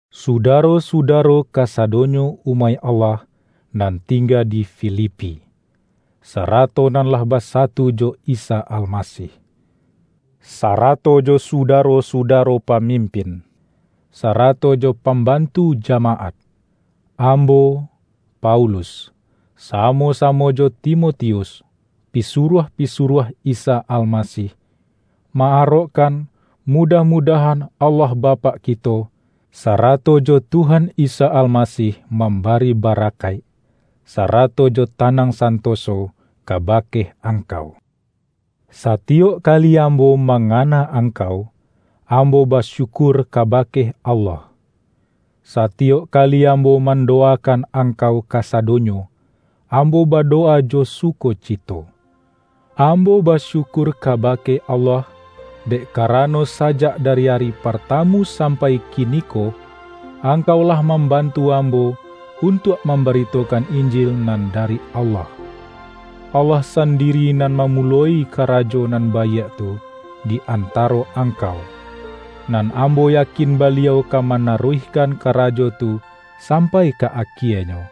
Sudaro-sudaro kasadonyo umaik Allah nan tingga di Filipi, sarato nan lah basatu jo Isa Almasih. Sara-to jo sudaro-sudaro pamimpin, sara-to jo pambantu jamaat! Ambo, Paulus, samo-samo jo Timo-tius, pisuruah-pisuruah Isa Almasih, ma-arokkan mudah-mudahan Allah Bapak kito, sarato jo Tuhan Isa Almasih mambari barakaik, sarato jo tanang santoso kabake angkau. Satiyok kali ambo mangana ang-kau, ambo basyukur kabake Allah. Satiyok kali ambo mandowakan ang-kau kasadonyo, ambo badowa jo suko-cito. Ambo basyukur kabake Allah, dek karano sajak dari ari partamu sampai kiniko, angkau lah mambantu ambo untuak mambaritokan Injil nan dari Allah. Allah sandiri nan mamu-loi karajo nan baiak tu di antaro ang-kau, nan ambo yakin Baliau ka mana-ruihkan karajo tu sampai ka akienyo,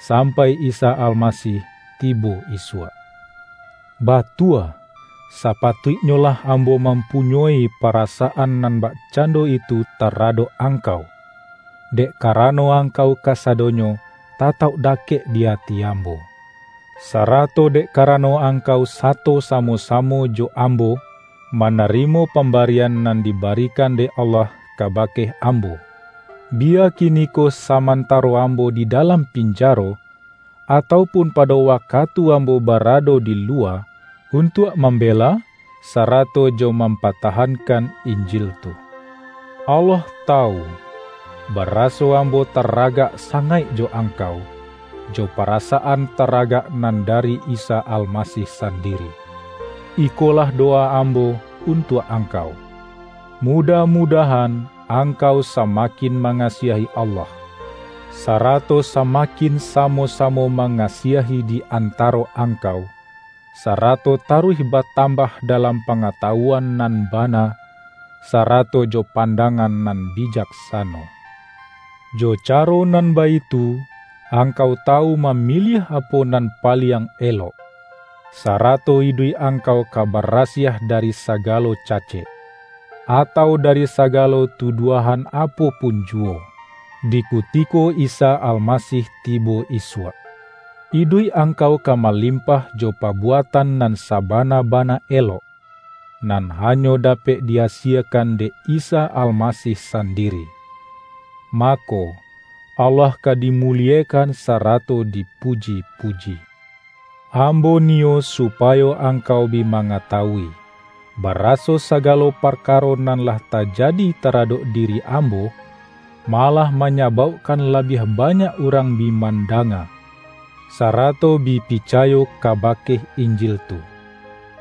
sampai Isa Almasih tibo isuak. Ba-tua, sapatuiknyolah ambo mampu-nyoi parasaan nan bakcando itu ta-radok angkau, dek karano angkau kasadonyo tatauk dakek di ati ambo. Sarato dek karano angkau sato samo-samo jo ambo, manarimo pambarian nan dibarikan dek Allah kabake am-bo; biya kiniko samantaro ambo di dalam pinjaro, atau pun pado wakatu ambo barado di luwa, untuak mambe-la, sarato jo mampatahankan Injil tu. Allah tawu, baraso ambo taragak sa-ngaik jo angkau, jo parasaan taragak nan dari Isa Almasih sandiri. Ikolah dowa ambo untuak ang-kau: mudah-mudahan angkau sama-kin mangasiahi Allah, sarato sama-kin samo-samo mangasiahi di antaro angkau, sarato taruih batambah da-lam pangatawuan nan bana, sarato jo pandangan nan bijaksano. Jo ca-ro nan baitu, angkau tawu mamiliah apo nan paliang elok, sarato iduik angkau ka barasiah dari sagalo ca-cek, atau dari sagalo tuduahan apo pun juwo, di kutiko Isa Almasih tibo isuak. Iduik angkau ka malimpah jo pabuatan nan sabana-bana elok, nan hanyo dapek di-asiekan dek Isa Almasih sandiri; mako, Allah ka di-muliekan sarato dipuji-puji. Ambo niyo supayo angkau bi ma-ngatawui, baraso sagalo parkaro nan lah tajadi taradok diri ambo, malah manyabaukkan labiah banyak urang bi mandanga, sarato bi picayo kaba-ke Injil tu.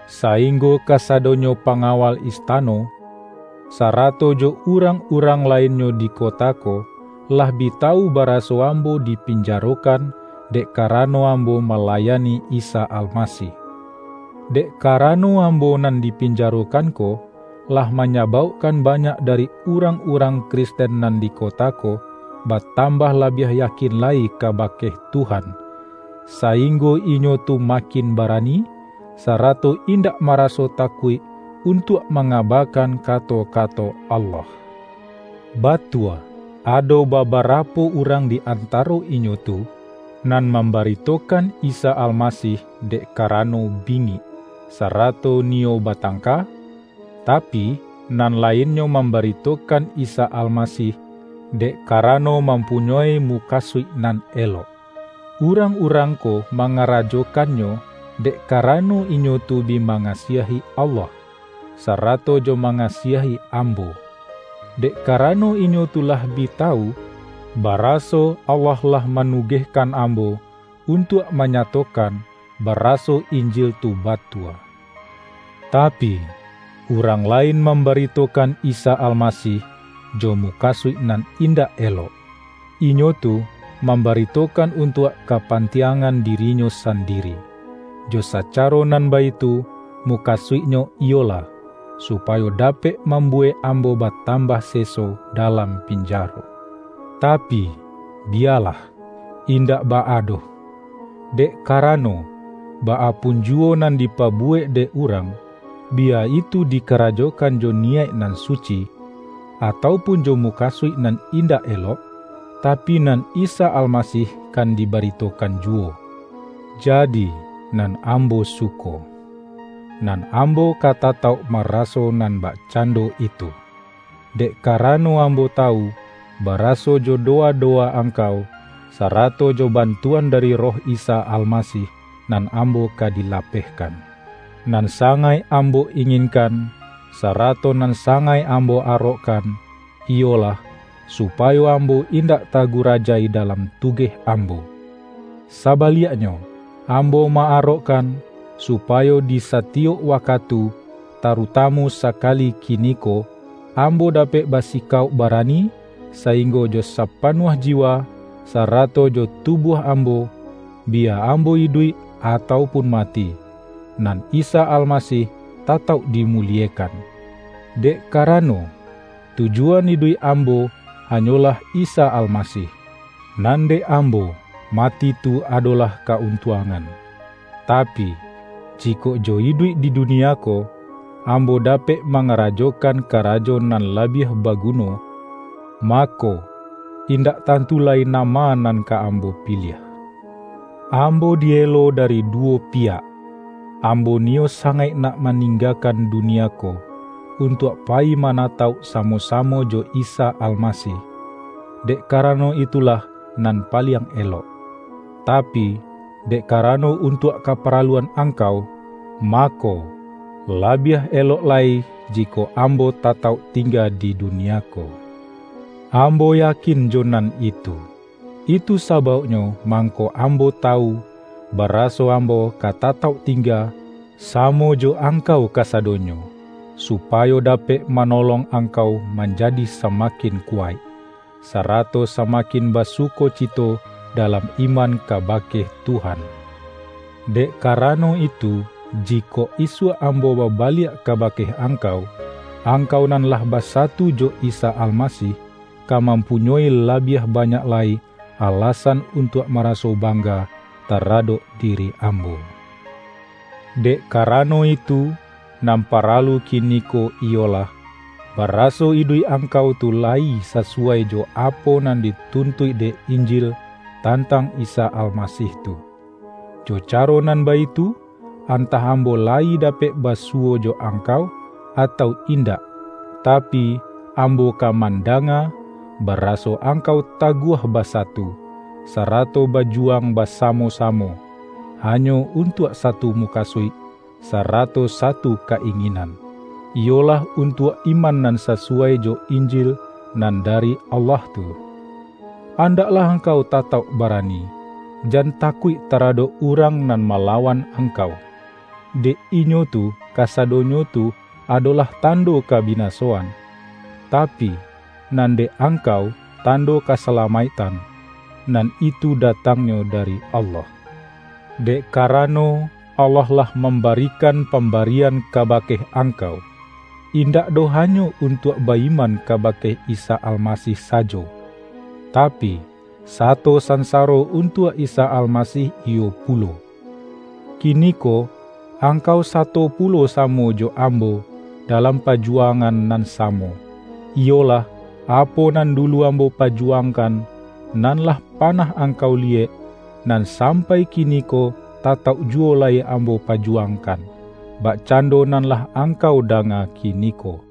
Sainggo kasadonyo pa-ngawal istano, sarato jo urang-urang lainnyo di kota ko, lah bi tawu baraso ambo dipinjarokan dek karano am-bo malayani Isa Almasih. Dek ka-rano ambo nan dipinjarokan ko, lah manyabaukkan banyak dari urang-urang Kristen nan di kota ko, batam-bah labiah yakin lai kabake Tuhan, sainggo inyo tu makin barani, sarato indak maraso takuik untuak manga-bakan kato-kato Allah. Batua ado babarapo urang di an-taro inyo tu, nan mambaritokan Isa Almasih dek karano bingik, sara-to niyo batangka, tapi, nan lainnyo mambaritokan Isa Almasih, dek ka-rano mampunyoi mukasuik nan elok. Urang-urang ko mangarajokannyo dek karano inyo tu bi mangasiahi Allah, sarato jo mangasiahi ambo, dek karano inyo tu lah bi tawu, ba-raso Allah lah manugehkan ambo un-tuak manyatokan baraso Injil tu ba-tua. Tapi, urang lain mambaritokan Isa Almasih, jo mukasuik nan indak elok; inyo tu mambaritokan untuak kapantiangan dirinyo sandiri. Jo sa-caro nan baitu, mukasuiknyo iyolah, supayo dapek mambuwek ambo ba-tambah seso dalam pinjaro. Tapi, biyalah, indak baa doh! Dek karano, baa pun juwo nan dipabuwek dek urang, biya itu dikarajokan jo ni-yaik nan suci, atau pun jo mukasuik nan indak elok, tapi nan Isa Almasih kan dibaritokan juwo; jadi, nan am-bo suko. Nan ambo ka tatauk maraso nan bakcando itu, dek karano am-bo tawu, baraso jo dowa-dowa ang-kau, sarato jo bantuan dari Roh Isa Almasih, nan ambo ka dilapehkan. Nan sangaik ambo inginkan, sara-to nan sangaik ambo arokkan, iyolah, supayo ambo indak tagurajai dalam tugeh ambo. Sabaliaknyo ambo ma-arokkan, supayo di satiyok wakatu, tarutamu sakali kiniko, ambo dapek basikauk barani, sainggo jo sapanuah jiwa, sarato jo tubuah ambo, — biya ambo iduik atau pun mati — nan Isa Almasih tatauk dimuliekan Dek karano, tujuan iduik ambo hanyolah Isa Almasih! Nan dek ambo, mati tu adolah ka-untuangan. Tapi, jikok jo iduik di dunia ko, ambo dapek ma-ngarajokan karajo nan labiah bagu-no, mako, indak tantu lai nama nan ka ambo piliah. Ambo di-elo dari duwo piyak. Ambo niyo sangaik nak maninggakan dunia ko, untuak payi manatauk samo-samo jo Isa Almasih, dek karano itulah nan paliang elok; tapi, dek karano untuak kaparaluan angkau, mako, labiah elok lai ji-kok ambo tatauk tingga di dunia ko. Ambo yakin jo nan itu. Itu sabauk-nyo mangko ambo tawu, baraso am-bo ka tatauk tingga samo jo angkau kasadonyo, supayo dapek manolong angkau manjadi samakin kuwaik, sa-rato samakin basukocito dalam iman kabake Tuhan. Dek karano itu, ji-kok isuak ambo babaliak kabake ang-kau, angkau nan lah basatu jo Isa Almasih, ka mampunyoi labiah ba-nyak lai alasan untuak maraso bang-ga taradok diri ambo. Dek karano itu, nan paralu kini-ko iyolah, baraso iduik angkau tu layi sasuwai jo apo nan dituntuik dek In-jil tantang Isa Almasih tu. Jo caro nan baitu, antah ambo layi dapek basuwo jo angkau, atau indak, tapi, ambo ka mandanga, baraso angkau taguah ba-satu, sarato bajuwang basamo-samo, hanyo untuak satu mukasuik, sarato satu ka-inginan; iyolah untuak iman nan sasuwai jo Injil nan dari Allah tu. Andaklah angkau tatauk barani; jan takuik taradok urang nan mala-wan angkau. Dek inyo tu kasadonyo tu adolah tando kabinasoan, tapi, nan dek angkau tando kasalamaiktan, nan itu datangnyo dari Allah. Dek kara-no, Allah lah mambarikan pambarian kabake angkau, indak doh hanyo un-tuak ba-iman kabake Isa Almasih sajo, tapi, sato sansaro untuak Isa Almasih iyo pulo. Kiniko angkau sato pu-lo samo jo ambo, dalam pajuwangan nan samo; iyolah, apo nan dulu ambo pajuwangkan, nan lah panah angkau liyek, nan sampai kiniko tatauk juwo lai ambo pajuwangkan, bakcando nan lah angkau danga kiniko.